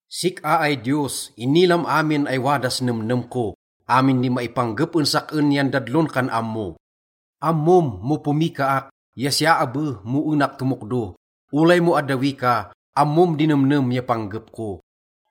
Sik-a ay Diyos, inilam amin ay wadas nemnem ko, amin di maipanggep en sak-en yan dadlon kan ammo. Ammom mo pomikaak ya siya abe mo enak tomokdo, olay mo addawi ka, ammom di nemnem ya panggep ko.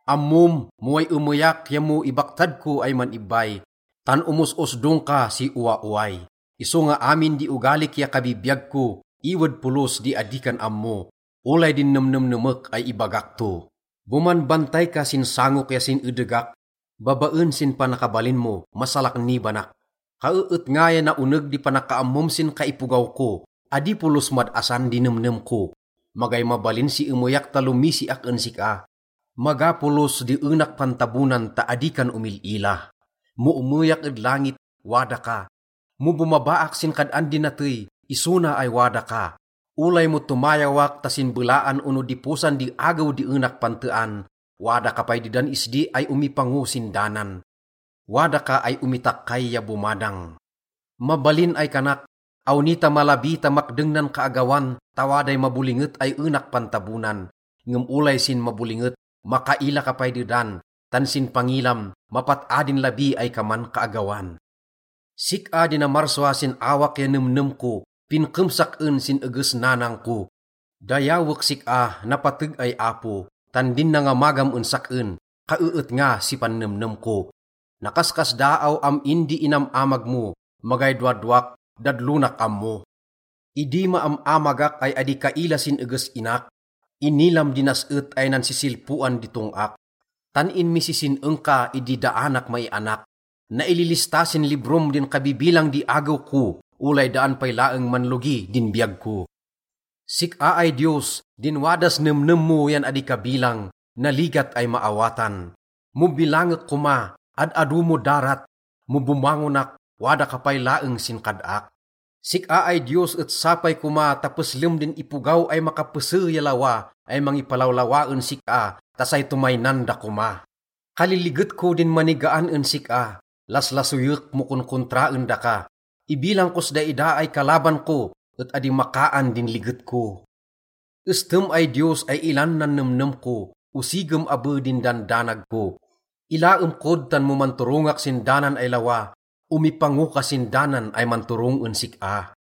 Ammom mo way emeyak ya mo ibaktad ko ay man-ibbay, tan omos-osdong ka si owaoway, isonga amin di ogalik ya kabibiyag ko, iwed polos di adi kan ammo, olay din nemnemnemek ay ibagak to. Bomanbantay ka sin sangok ya sin edegak, babaen sin panakabalin mo, masalaknibanak. Kaeetnga ya naoneg di panakaammom sin kaipogaw ko, adi polos mad-asan di nemnem ko. Magay mabalin si emeyak ta lomisiak en sik-a, maga polos di enak pantabonan ta adi kan omil-ila. Mo emeyak ed langit, wada ka, mo bomabaak sin kad-an di natey, iso na ay wada ka. Olay mo tomayawak ta sin belaan ono diposan di agew di enak pantean, wada ka pay dedan isdi ay omipango sin danan, wada ka ay omitakkay ya bomadang. Mabalin ay kanak, “Awni ta malabi ta makdeng nan kaagawan, ta waday mabolinget ay enak pantabonan.” Ngem olay sin mabolinget, makaila ka pay dedan, tan sin pangilam, mapat-a din labi ay kaman kaagawan. Sik-a di namarsua sin awak ya nemnem ko, pinkem sak-en sin eges nanang ko. Dayawek sik-a, napateg ay Apo, tan din nangamagam en sak-en et kaeetnga si pannemnem ko. Nakaskasdaaw am-in di inam-amag mo, magay dowadowak, dadlonak ammo. Idi maam-amagak ay adi kaila sin eges inak, inilam di nas-et ay nansisilpoan di tong-ak, tan inmisisin-eng ka idi daanak maianak. Naililista sin librom din kabibilang di agew ko, olay daan pay laeng manlogi din biyag ko. Sik-a ay Diyos, din wadas nemnem mo yan adi kabilang, naligat ay maawatan. Mo bilangek koma, ad-ado mo darat, mo bomangonak, wada ka pay laeng sin kad-ak. Sik-a ay Diyos et sapay koma ta peslem din ipogaw ay makapese ya lawa ay mangipalawlawa en sik-a ta say tomaynan da koma. Kaliliget ko din manigaan en sik-a, laslasoyek mo konkontraen daka. Ibilang kos daida ay kalaban ko, et adi makaan din liget ko. Estem ay Diyos ay ilan nan nemnem ko, osigem abe din dandanag ko. Ilaem kod tan mo manturongak sin danan ay lawa, omipango ka sin danan ay manturong en sik-a.